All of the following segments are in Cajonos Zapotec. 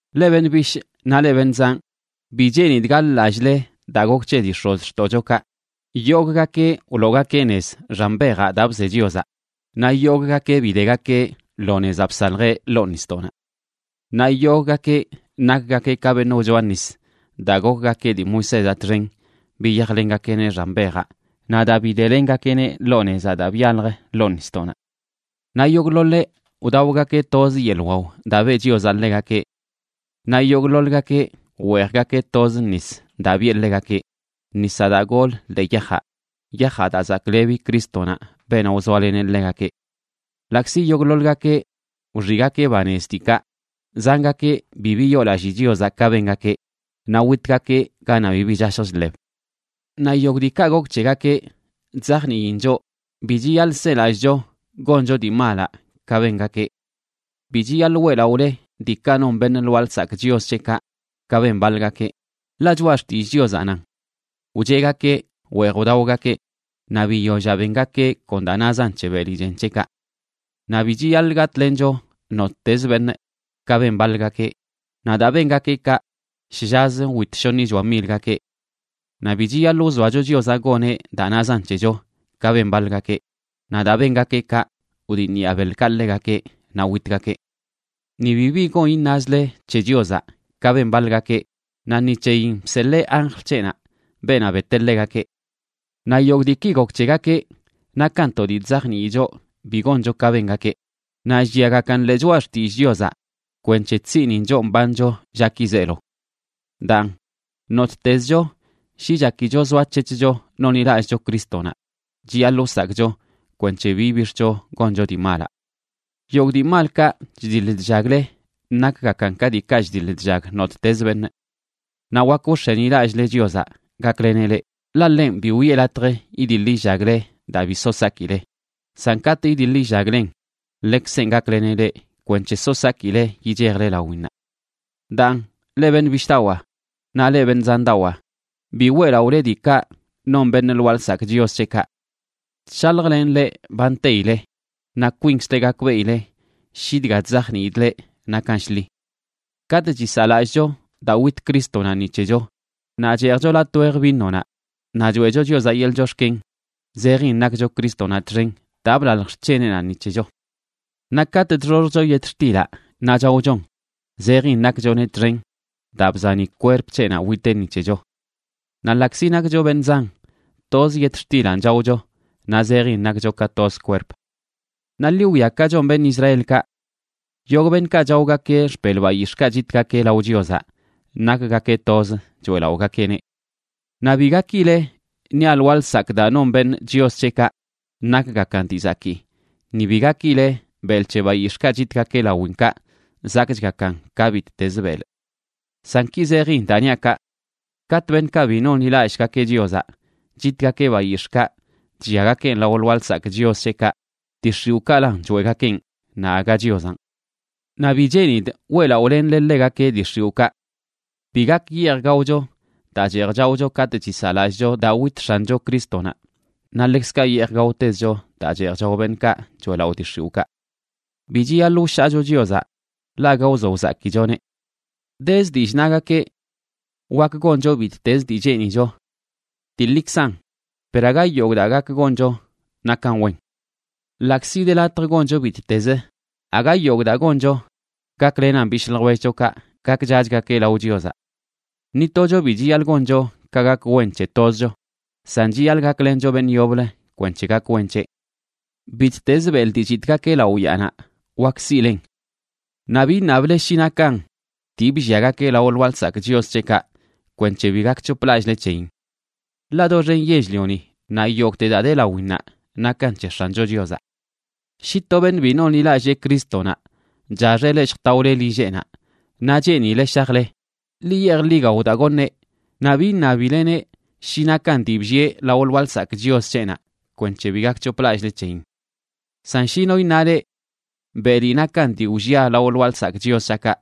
Leꞌ beṉꞌ bishꞌ naꞌ leꞌ beṉꞌ zanꞌ, bi cheenidꞌ gaḻ-lallꞌle daa gok c̱he dii x̱ozxtoꞌchokaꞌ, yogꞌgakeꞌ wloogakeꞌ nez xan bejaꞌ daa bze Chiozaꞌ naꞌ yogꞌgakeꞌ bidegakeꞌ lo nezaꞌ bsaljeꞌ ḻoo nisdoꞌnaꞌ. Naꞌ yogꞌgakeꞌ nakgakeꞌ ka beṉꞌ wchoa nis daa gokgakeꞌ dii Moisézaꞌ txen biyajlengakeꞌneꞌ xan bejaꞌ naꞌ daa bidelengakeꞌneꞌ lo nezaꞌ daa byalj ḻoo nisdoꞌnaꞌ. Naꞌ yogꞌḻoḻeꞌ wdaogakeꞌ toz yeḻꞌ wao daa beꞌ Chiozaꞌ ḻegakeꞌ. Naꞌ yogꞌḻoḻgakeꞌ weejgakeꞌ toz nis daa biꞌe ḻegakeꞌ, nisaꞌ daa gol ḻee yajaꞌ, yajaꞌ daa zaklebi Crístonaꞌ, beenaꞌ wzoaleneꞌ ḻegakeꞌ. Ḻaꞌkzi yogꞌḻoḻgakeꞌ wxiꞌgakeꞌ banez diikaꞌ, zangakeꞌ bi biyoolallii Chiozaꞌ ka bengakeꞌ, naꞌ witgakeꞌ ganaꞌ bibi chashj chḻeb. Naꞌ yogꞌ diikaꞌ gok c̱hegakeꞌ chzajniin choꞌ bi chiyaḻꞌ selallꞌcho goncho dii malaꞌ ka bengakeꞌ. Bi chiyaḻꞌ weꞌlaꞌole diikaꞌ non beṉꞌ lwaa lsakꞌ chios c̱heꞌkaꞌ ka ben baḻgakeꞌ, ḻaꞌ Choꞌa Xtillꞌ Chiozaꞌ nan: “Wcheꞌgakeꞌ weej wdaogakeꞌ naꞌ biyollaꞌ bengakeꞌ kon daa nazan c̱he beli chen c̱heꞌkaꞌ.” Naꞌ bi chiyaḻꞌ gatꞌlencho nottez beṉꞌ, ka ben baḻgakeꞌ, naꞌ daa bengakeꞌ kaꞌ, shllaz wit shoṉichoa milgakeꞌ. Naꞌ bi chiyaḻꞌ wzoacho Chiozaꞌ goneꞌ daa nazan c̱hecho, ka ben baḻgakeꞌ, naꞌ daa bengakeꞌ kaꞌ wdiṉyaa beḻkaꞌ ḻegakeꞌ naꞌ witgakeꞌ. Ni bibi gon iṉazle c̱he Chiozaꞌ ka ben baḻgakeꞌ naꞌ ni c̱heyin bseḻee anjl c̱heꞌnaꞌ beenaꞌ beteꞌ ḻegakeꞌ. Naꞌ yogꞌ diiki gok c̱hegakeꞌ nakan to dii chzajnii choꞌ bi goncho ka bengakeꞌ, naꞌ lliagakan ḻee Choꞌa Xtillꞌ Chiozaꞌ kwenc̱he chsiꞌnin choꞌ mbancho llaki zeelo. Daan, nottezcho shi chakicho zoac̱hec̱hcho nonḻilallꞌcho Crístonaꞌ, chiyaḻꞌ wsakꞌcho kwenc̱he bi ibix̱cho goncho dii malaꞌ. Yogꞌ dii malkaꞌ chdiḻ chllagle nakgakan ka diikaꞌ chdiḻ chllag nottez beṉꞌ. Naꞌ wak wx̱enilallꞌle Chiozaꞌ gakleneꞌ leꞌ, ḻaꞌ ḻenꞌ bi wiꞌe latj idiḻ illagle daa bi so sakile, san katꞌ idiḻ illaglen, ḻekzenꞌ gakleneꞌ leꞌ kwenc̱he so sakile yichejle lawinnaꞌ. Daan, leꞌ beṉꞌ bishꞌdawaa naꞌ leꞌ beṉꞌ zandawaa, bi weꞌlaꞌole diikaꞌ non beṉꞌ lwaa lsakꞌ chios c̱heꞌkaꞌ. Chshaljlenꞌ leꞌ ba nteile, naꞌ kwinkzle gakbeꞌile shi dga chzajniidꞌ leꞌ nakan shḻi. Katꞌ chisaꞌlallꞌcho daa wit Crístonaꞌ ni c̱hecho, naꞌ cheejcho latꞌ wej vinonaꞌ naꞌ choeꞌcho Chiozaꞌ yeḻꞌ chox̱ken, zejin nakcho Crístonaꞌ txen daa blalj xc̱heneꞌnaꞌ ni c̱hecho. Naꞌ katꞌ chxoxjcho yetxtilaꞌ naꞌ chaochon, zejin nakchoneꞌ txen daa bzani kwerp c̱heꞌnaꞌ witeꞌ ni c̱hecho. Naꞌ ḻaꞌkzi nakcho beṉꞌ zan, toz yetxtilanꞌ chaocho, naꞌ zejin nakcho ka toz kwerp. Naꞌ ḻi wwia ka chon beṉꞌ Israelkaꞌ. Yogꞌ beṉꞌkaꞌ chaogakeꞌ xpelꞌ bayix̱ꞌkaꞌ chitgakeꞌ lao Chiozaꞌ nakgakeꞌ toz choeꞌlaꞌogakeꞌneꞌ. Naꞌ bi gakile niaꞌ lwaa lsakꞌ daa non beṉꞌ chios c̱heꞌkaꞌ nakgakan dii zakii, ni bi gakileꞌ belꞌ c̱he bayix̱ꞌkaꞌ chitgakeꞌ lawinkaꞌ zakꞌchgakan ka bittezə belꞌ. San ki zejin daa niaꞌ kaꞌ: katꞌ beṉꞌkaꞌ bi nonḻilallꞌgakeꞌ Chiozaꞌ chitgakeꞌ bayix̱ꞌkaꞌ chlliagakeꞌn lao lwaa lsakꞌ chios c̱heꞌkaꞌ, dii x̱iwꞌkaꞌlan choeꞌgakeꞌn, naꞌ aga Chiozanꞌ. Naꞌ bi cheenidꞌ weꞌlaꞌolenle ḻegakeꞌ dii x̱iwꞌkaꞌ. Bi gak yeej gaocho daa cheej chaocho katꞌ chisaꞌlallꞌcho daa wit X̱ancho Crístonaꞌ, naꞌ ḻekzkaꞌ yeej gaotezcho daa cheej chao beṉꞌkaꞌ choeꞌlaꞌo dii x̱iwꞌkaꞌ. Bi chiyaḻꞌ wshaacho Chiozaꞌ, ḻaꞌ aga wzo wzakichoneꞌ. Dez dillꞌ, nagakeꞌ: “Wak goncho bittez dii cheenicho.” Dii ḻikzan, per aga yogꞌ daa gak goncho nakan wen. Ḻaꞌkzi de latj goncho bittezə, aga yogꞌ daa goncho gaklenan bishꞌ ljwellchokaꞌ gakchachgakeꞌ lao Chiozaꞌ. Ni tocho bi chiyaḻꞌ goncho ka gak wen c̱he tozcho, san chiyaḻꞌ gaklencho beṉꞌ yoblə kwenc̱he gak wen c̱heꞌ. Bittezə belꞌ dii chitꞌgakeꞌ lao yaanaꞌ wakə siꞌlen. Naꞌ bi iṉable shi nakan dii blliagakeꞌ lao lwaa lsakꞌ chios c̱heꞌkaꞌ kwenc̱he bi gakc̱hoplallꞌle c̱heyin. Ḻaꞌ doxen yell-lioni naꞌ yogꞌte daa de lawinnaꞌ nakan c̱he X̱ancho Chiozaꞌ. Shi to beṉꞌ bi nonḻilallee Crístonaꞌ chaxeꞌ leꞌ lljtaole lilleꞌnaꞌ, naꞌ cheenileꞌ shajle, ḻi yeej ḻi gao daa goṉeꞌ, naꞌ bi iṉabileneꞌ shi nakan dii bllieꞌ lao lwaa lsakꞌ chios c̱heꞌnaꞌ kwenc̱he bi gakc̱hoplallꞌle c̱heyin. San shi no iṉa leꞌ: “Beli nakan dii wllia lao lwaa lsakꞌ chios c̱haꞌkaꞌ”,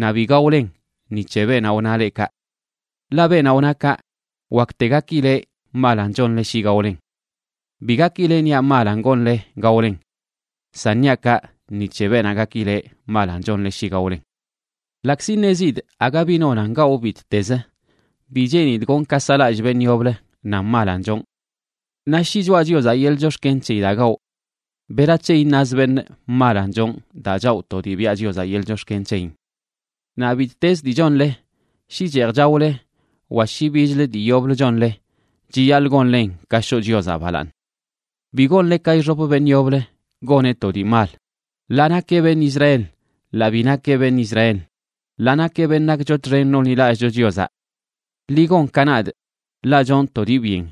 naꞌ bi gaolen ni c̱he beenaꞌ wna leꞌ kaꞌ. Ḻaꞌ beenaꞌ wna kaꞌ wakte gakileꞌ malan chonle shi gaolen. Bi gakile niaꞌ malan gonle gaolen, san niaꞌ kaꞌ ni c̱he beenaꞌ gakileꞌ malan chonle shi gaolen. Ḻaꞌkzi ṉezidꞌ aga bi nonan gawꞌ bittezə, bi cheenidꞌ gonꞌ ka saꞌlallꞌ beṉꞌ yoblə nan malanꞌ chonꞌ. Naꞌ shi choꞌa Chiozaꞌ yeḻꞌ chox̱ken c̱heyi daa gawꞌ, ¿berac̱he iṉaz beṉꞌ malan chonꞌ daa chawꞌ to dii ba biꞌa Chiozaꞌ yeḻꞌ chox̱ken c̱heyin? Naꞌ bittezə dii chonle, shi cheej chaole wa shi bichlə dii yoblə chonle, chiyaḻꞌ gonlen ka shoꞌ Chiozaꞌ balaaṉ. Bi gonle ka ixop beṉꞌ yoblə goneꞌ to dii mal, ḻaa nakeꞌ beṉꞌ Israel, ḻaa bi nakeꞌ beṉꞌ Israel, ḻaa nakeꞌ beṉꞌ nakcho txen nonḻilallꞌcho Chiozaꞌ. Ḻi gon ka nadꞌ, ḻaꞌ chonꞌ to dii byen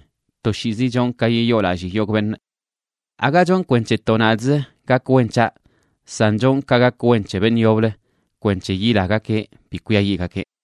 toshiizi chonꞌ ka yiyoolallii yogꞌ beṉꞌ. Aga chonꞌ kwenc̱he to nadꞌzə gak wen c̱haꞌ, san chonꞌ ka gak wen c̱he beṉꞌ yoblə kwenc̱he yilagakeꞌ bi kwiayiꞌgakeꞌ.